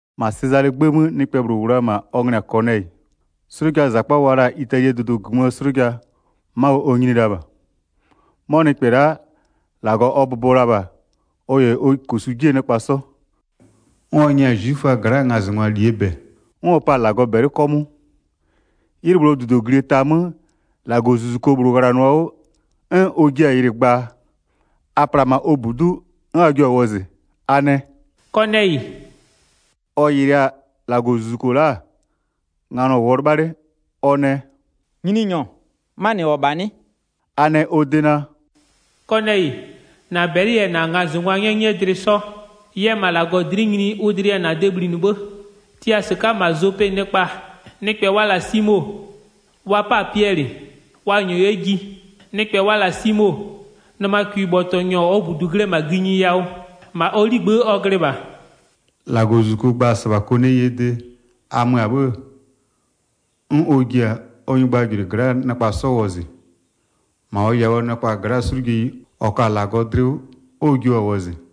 1-Ma Sezalee 'gbë 'mö nɩkpɛ -bhlʋ -wʋ la-a -ma, ɔ nglɩ-ɩ -yɛ-a Kɔnɛyɩ. 'Slʋjaa -zakpa wa la-a Italie dʋdʋ -gömöö 'slʋja-a, ma ɔ nyini la -bha. 'Mɔ nɩkpɛ la'a, -Lagɔ ɔ bʋbɔ la -bha, ɔ -yɛ ɔ -kosu 'jie nɩkpa 'sɔ. 'N ɔ nyɛ-a 'zwiföa gla'aa ngazɩngwa -lie -bɛ. 'N ɔ pa-a -Lagɔ -bɛlɩ 'kɔmʋʋ. 'Ylɩ -bhlʋɔ -dudoglie ta 'mö, -Lagɔzuzuko -bhlʋ ghlanɩɔ-a 'wʋ 'n ɔ jia-a yɩlɩ gbaa. A pla-a -ma ɔ -budu'u 'n a jio-a wɔzɩ, a nɛ: “Kɔnɛyɩ!” Ɔ yɩlɩ-a -Lagɔzuzuko la'a, nganɔ -wʋɔ 'lɩbha 'le, ɔ nɛ: “Nyininyɔ, 'manɩ -wʋ-ɔ -bha 'nɩ?” A nɛ -bha ɔ de naa: “Kɔnɛyɩ, -na -bɛlɩ -yɛ -na ngazɩngwaa 'nyɛnyɩɛ 'sɔ yɛ -ma -Lagɔ dlɩ'ɩ nyini ʋ dlɩ yɛ ɩ de bhlinɩ 'bhë. Tia -sɩka'a -ma Zope nɩkpa, nɩkpɛ wa la-a Simo, wa 'pa-a Piɛlɩ, wa -nyɔɔ 'yɛ ji. Nɩkpɛ wa la-a Simo, nɩmakwibhɔtɔnyɔ -ɔɔ -budu glɩ-ɛ -ma gïnyi yawʋ, -ma ɔ 'ligbë'ë ɔ glɩ -bha.” 7-Lagɔzuzuko gba-a -sɩbha Kɔnɛyɩɛ de, a mö-a 'bhë-ë, 'n ɔ ji-a ɔ nyɩgbajʋlʋɩ gla'aa nɩkpa 'sɔ wɔzɩ, -ma ɔ yawʋɔ nɩkpa gla'a 'slʋjeyi -ɔ ka-a -Lagɔ dlɩ 'wʋ, 'n ɔ jio 'yɛ-a wɔzɩ.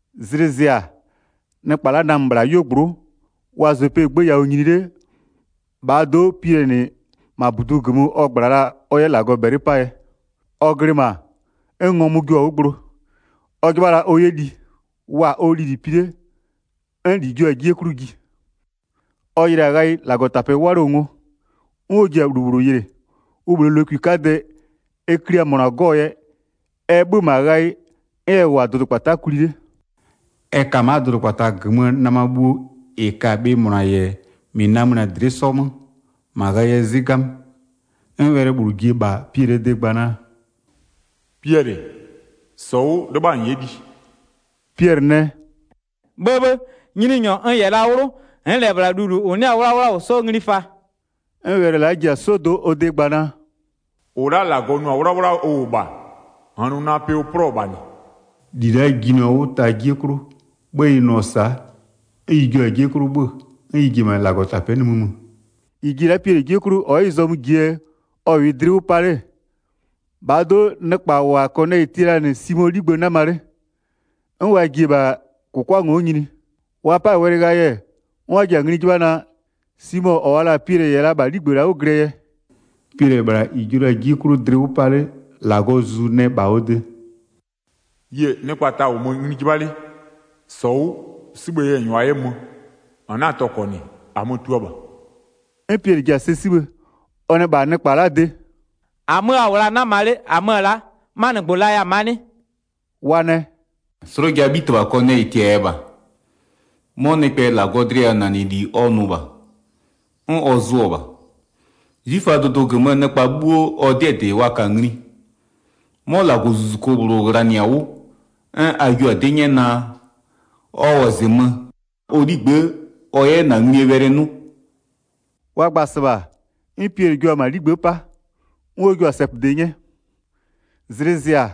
Zlɩ zɩ-a, nɩkpa la'a namö -bhla 'yuogblʋ'ʋ, wa-a Zopee 'gbë yawʋ nyini 'le, -bhaa do'o Piɛlɩɛ -nɩ-ɛ, -ma -budu -gömö ɔ -gbla-a ɔ 'yɛ -Lagɔ -bɛlɩ 'paa yɛ. Ɔ glɩ -ma, 'n ngɔmʋ jio-a 'wʋ gblo. Ɔ 'jɩbha la ɔ 'yɛ li. Wa-a ɔ lili pi 'le, 'n -li jio-a 'jie 'klʋ ji. Ɔ yɩlɩ-a ghayɩ -Lagɔtapɛ 'walɩɔ-ɔ ngo. 'N ɔ ji-a -lu -bhlʋ yɩlɩ, ʋ -bhlee lokwi 'kadɛ, ɛ klia -mʋna 'gɔ-ɔ yɛ, ɛ 'bhö-ö -ma ghayɩ, 'n ɛ -wʋ-a dʋdʋkpata'a kwli 'le. Ɛ ka ma'a dʋdʋkpata -gömöö nɩma bhuo -ɩ ka-a bhɩ -mʋna -yɛ -mɩ namönɩ-a dlɩ'ɩ 'sɔ 'mö, -ma ghayɩɛ 'zɩ 'gamö. 'N wɛlɩ -bhlʋ ji-e -bha Piɛlɩɛ de gba naa: “Piɛlɩ, -sɔ 'wʋ 'lɩbha -n 'yɛ li.” Piɛlɩ nɛ: “'Bhëbhë, Nyininyɔ n -yɛ la 'wlʋ, n'n -lɛ -bhla -aa gba -yɛ -lu -ʋ 'nɩ-a 'wlawla -wʋ 'sɔ ngli fa.” 'N wɛlɩ la'a ji-a 'sɔdo'o ɔ de gba naa: “-Ʋ la'a -Lagɔ nʋ-a 'wlawla ʋ -wʋ -bha, -n 'na-a nʋ pɩ ʋ 'plɔ-ɔ -bha -nɩ.” 16-Li la'a jinɩɔ 'wʋ ta 'jie 'klʋ. 'Bhë ɩ nʋ-ɔ sa'a, 'n ɩ jio-a 'jie 'klʋ 'bhö-ö, 'n ɩ ji-e -ma -Lagɔtapɛ'ɛ nimï mö. 17-Ɩ ji-e la'a Piɛlɩ 'jie 'klʋ ɔ'ɔ ɩ zɔmö -jie yɛ ɔ -wʋɩ dlɩ 'wʋ 'pa 'le-e, -bhaa do'o nɩkpa -wa Kɔnɛyɩ tia la-a -nɩ Simoo 'ligbë 'nama 'le, 'n wa ji-e -bha -kʋkwa ngo'o nyini. Wa 'pa-a wɛlɩ ghayɩ, 'n wa ji-a ngli 'jɩbha naa, Simo -ɔ wa la-a Piɛlɩ -yɛ la -bha 'ligbë la'a 'wʋ glɩɛ yɛ. Piɛlɩ-ɛ -bhla -ɩ jio la-a 'jie 'klʋ dlɩ 'wʋ 'pa 'le, -Lagɔɔ Zuzu nɛ -bha ɔ de: “Yie, nɩkpa ta -wʋmö ngli 'jɩbha 'le. 20-Sɔ 'wʋ, 'sibhë yɛ -n -nyʋa 'yɛ mö. -N 'na-a tɔkɔ -nɩ, -amö-ö tua -bha.” 'N Piɛlɩ ji-a sɛ 'sibhë, ɔ nɛ -bha nɩkpa la'aa de: “-Amö a -wʋ la-a 'nama 'le, -amö-ö la'a, 'manɩgbʋ laya-a ma'a 'nɩ?” Wa nɛ: “'Slʋjaa 'bhitɩbha Kɔnɛyɩ -tiaya -bha, 'mɔ nɩkpɛ -Lagɔɔ dlɩyawʋnanɩli ɔ nʋ -bha, 'n ɔ zʋʋ-ɔ -bha. 'Zwiföaa dʋdʋ -gömöö nɩkpa 'bhuo ɔ 'dɩɛ -dɩ wa ka-a ngli. 'Mɔ -Lagɔzuzuko -bhlʋ ghlanɩ-a 'wʋ 'n a jio-a 'dɩ 'nyɛ naa, ɔ -wɔzɩmö -ma ɔ 'ligbë'ë ɔ 'yɛ -na nglie wɛlɩ 'nʋ.” Wa gba-a -sɩbha, 'n Piɛlɩ jua-a -ma 'ligbë'ë 'pa, 'n ɔ jua-a sɛpöde 'nyɛ. Zlɩ zɩ-a,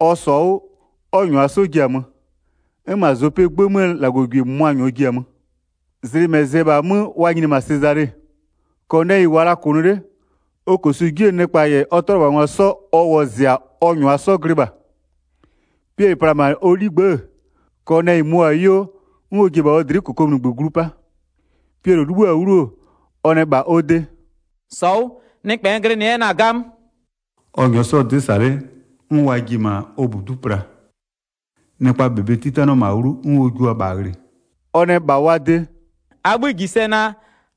ɔ -sɔ-a 'wʋ, 'n ɔ -nyʋa 'sɔ ji-a 'mö. 'N -ma Zopee 'gbë 'möö -Lagɔgwie -mʋmʋa -nyɔɔ ji-a mö. Zlɩ -mɛ zɩ-ɛ -bhaa 'mö wa nyini-e -ma Sezale. Kɔnɛyɩ -wʋʋa la -kʋnʋ 'le, ɔ -kosu 'jie nɩkpa -yɛ ɔ 'tʋalɩbhangwa 'sɔ ɔ wɔzɩ-a ɔ -nyʋa 'sɔ glɩ -bha. Piɛlɩ pla-a -ma ɔ 'ligbë'ë, Kɔnɛyɩ möɔ-a 'yuo, 'n ɔ ji-e -bha ɔ dlɩ'ɩ -kokomunigbö glu 'pa. Piɛlɩ 'libhïɔ-a 'wlu, ɔ nɛ -bha ɔ de: “-Sɔ 'wʋ, nɩkpɛ n glɩnɩ 'yɛ-ɛ na-a 'gamö.” Ɔ -nyɔɔ 'sɔ-ɔ 'dɩ -sa 'le, 'n wa ji-e -ma ɔ -budu'u pla. Nɩkpaa -bebe 'titanɩɔ -ma 'wlu 'n ɔ jua-a -bha ghlɩ. Ɔ nɛ -bha wa de: “A 'bhï -ji sɛ naa: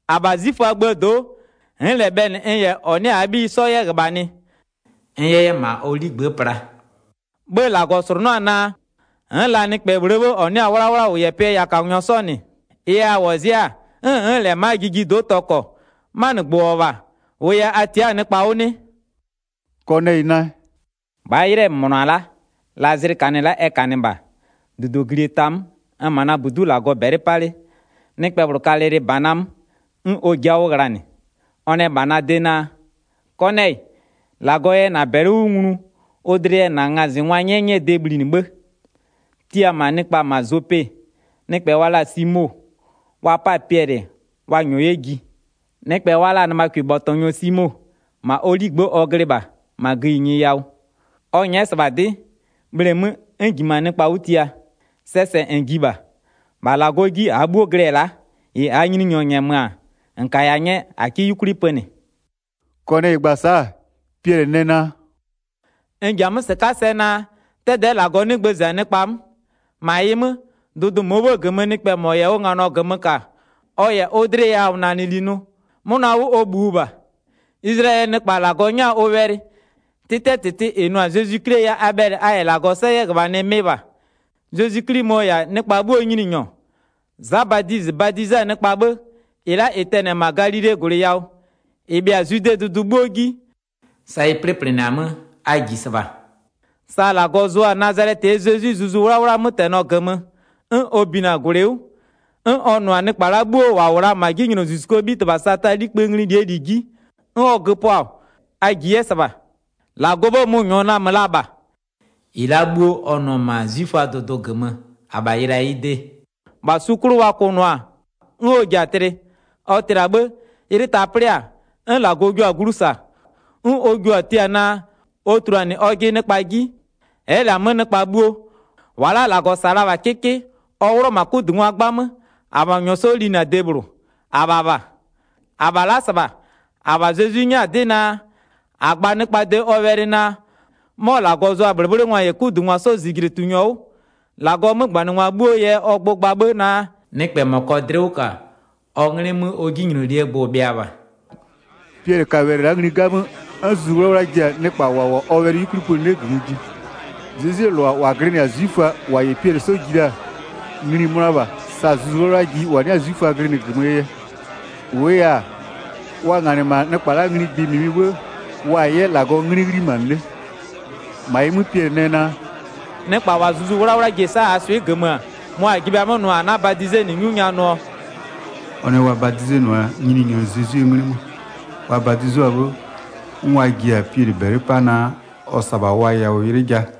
-Abha 'zwiföaa gböö do'o, n'n -lɛ bhɛlɩ n -yɛ -ɔ 'nɩ-a -aa 'bhiyi 'sɔ 'yɛ -ghöbhanɩ, n 'yɛ 'yɛ -ma ɔ 'ligbë'ë pla. 'Bhë -Lagɔ -slʋnʋ'ʋ-a naa, n'n la nɩkpɛ -bhlʋɔ 'bhë -ɔ 'nɩ-a 'wlawla -wʋ -yɛ pɩɛ yawʋkanyɔ 'sɔ -nɩ. Ɩ yɛ a -wɔzɩ'ɩ-a 'n n'n -lɛ-a ma'aa jijido'o tɔkɔ. 'Manɩgbʋ -wʋ-ɔ -bha, -ʋʋ yɛ a tia'a-a nɩkpa 'wʋ 'nɩ?” Kɔnɛyɩ nɛ: “-Bhaa 'ylɩɛ -mʋna-a la'a, la zlɩ -kanɩ-ɛ la'a ɛ -kanɩ -bha, -dudoglie ta 'mö, n-n -ma na -budu'u -Lagɔ -bɛlɩ 'pa 'le, nɩkpɛ -bhlʋ ka lɩlɩbana 'mö, 'n ɔ ji'i-a 'wʋ ghlanɩ. Ɔ nɛ -bha na de naa: Kɔnɛyɩ, -Lagɔ yɛ -na -bɛlɩ 'wʋ nglu ʋ dlɩ yɛ -na ngazɩngwaa 'nyɛnyɩɛ de bhlinɩ 'bhë. Tia-a 'mö nɩkpa -ma Zope, nɩkpɛ wa la-a Simo, wa 'pa-a Piɛlɩ wa -nyɔɔ 'yɛ ji. Nɩkpɛ wa la-a nɩmakwibhɔtɔnyɔ Simo, -ma ɔ 'ligbë'ë ɔ glɩ -bha, -ma gïnyi yawʋ. Ɔ nyɛ'ɛ-ɛ -sɩbha 'dɩ, bhleemö 'n n -jimö-a nɩkpa 'wʋ tia. Sɛɛ -sɛ -n ji -bha. -Bha -Lagɔ 'ji -aa 'bhuo glɩ-ɛ la'a, -ɩ -aa Nyininyɔ -nyɛmö-a -n kaya 'nyɛ, -a 'kɩ 'yukwli pönɩ.” Kɔnɛyɩ gba-a sa'a, Piɛlɩ nɛ naa: “N ji-a 'mö -sɩka'a sɛ naa, 'dɛdɛ'ɛ -Lagɔ 'nɩ gbëzɩ-a nɩkpa 'mö. 35-Ma ɩ 'mö, dʋdʋ -mʋɔ 'bhë -gömöö nɩkpɛ -mɔ -yɛ ʋ nganɔ -gömö -ka, ɔ -yɛ ʋ dlɩyawʋnanɩli nʋ, 'mʋna 'wʋ ɔ -bhïʋ -bha. Izlayɛlɩɛ nɩkpa -Lagɔ 'nyɛ-a ʋ wɛlɩ. 'Tɩtɩɛ -tɩtɩ -ɩ nʋ-a Zezwi 'Klie yɛ a bhɛlɩ a -yɛ -Lagɔ 'sɔ 'yɛ -ghöbhanɩ mɩ -bha. Zezwi 'Kli mɔ-ɔ -yɛ-a nɩkpa 'bhuoo Nyininyɔ. Za Badizɩ badize-a nɩkpa 'bhë, -ɩ la'a -ɩ tɛnɩ-ɛ -ma Galilee -gwlɩ yawʋ, -ɩ bhɩa-a Zwidee dʋdʋ 'bhuo 'ji, sa ɩ 'plɩplɩnɩ-a 'mö, a -ji -sɩbha. Sa -Lagɔ zʋ-a Nazalɛtɩɛ Zezwi Zuzu 'Wlawlaa 'mötɛnɔ -gömö, 'n ɔ binɩ-a -gwlɩ 'wʋ, 'n ɔ nʋ-a nɩkpa la'a bhuo -wa -wʋ la-a -ma 'jinylozuzukuo 'bhitɩbha Sataa 'likpï ngli -lie -li 'ji, 'n ɔ göpʋa, a -ji 'yɛ -sɩbha. -Lagɔɔ 'bhë mʋ-ʋ -nyɔɔ namö la -bha. 39-Ɩ la'a 'bhuo ɔ nʋ-ɔ -ma 'zwiföaa dʋdʋ -gömö -abha yɩlɩ-a ɩ de. -Bha su 'klʋ wa kʋnʋɔ-a 'n ɔ ji-a tlɩ. Ɔ tlɩ-a 'bhë, 'ylɩ ta plɩ-a, 'n -Lagɔ jio-a glu -sa, 'n ʋ jio-a tia naa, ɔ tuluanɩ ɔjɩ nɩkpa 'ji. Ɛ'ɛ -lɛ-a 'mö nɩkpa bhuo. -Wa la'a -Lagɔ -sa-a la-a -bha 'kɩkɩ, ɔ 'wlʋ-ɔ -ma 'kudungwa 'gbamö, -abha ɔ -nyɔɔ 'sɔ linɩ-a de -bhlʋ, -abha -bha. 42-Abha la'a -sɩbha, -abha Zezwi 'nyɛ-a 'dɩ naa, -a gba nɩkpaa de ɔ wɛlɩ naa, 'mɔ -Lagɔ zʋa-a -bhlɩbhlɩngwa -yɛ 'kudungwa 'sɔɔ -zijlitunyɔ 'wʋ. 43-Lagɔɔ 'mögbanɩngwa 'bhuo yɛ ɔ gbʋ gba 'bhë naa, nɩkpɛɛ -mɔ -kɔɔ dlɩ 'wʋ -ka, ɔ 'nglɩ 'mö ɔ 'jinylolie gbʋ-ʋ bhɩa -bha.” Piɛlɩ ka wɛlɩ la'a ngli 'gamö, 'n Zuzu 'Wlawla ji-a nɩkpa -wa -wʋ-a ɔ wɛlɩ 'yukwli pönɩ 'le -gömö ji. Zezwie -lʋa -wa glɩnɩ-a 'zwiföa -wa -yɛ Piɛlɩ 'sɔ ji la-a, ngli-i mönʋa -bha sa Zuzu 'Wlawla ji -wa 'nɩ-a 'zwiföa glɩnɩ -gömöö yɛ. 46-Wʋʋ -yɛ-a, wa nganɩ -ma nɩkpa la'aa ngli gbɩ -mɩmɩ 'bhë, wa-a 'yɛ -Lagɔɔ 'nglɩ 'ghlimanɩ 'le. 47-Ma ɩ 'mö Piɛlɩ nɛ naa: “Nɩkpa -wa Zuzu 'Wlawla ji-e -sa -aa swɩ'ɩ -gömö-ö, mʋa -a ji bhe-a 'mö nʋ -a 'na-a badizenɩ 'nyu nya nʋɔ?” Ɔ nɛ wa badizenʋa Nyininyɔ Zezwie 'nglɩ 'mö. Wa badizʋa-a 'bhë, 'n wa ji-a Piɛlɩ -bɛlɩ 'pa naa ɔ -sa-a -bha wa yawʋ 'ylɩ ja.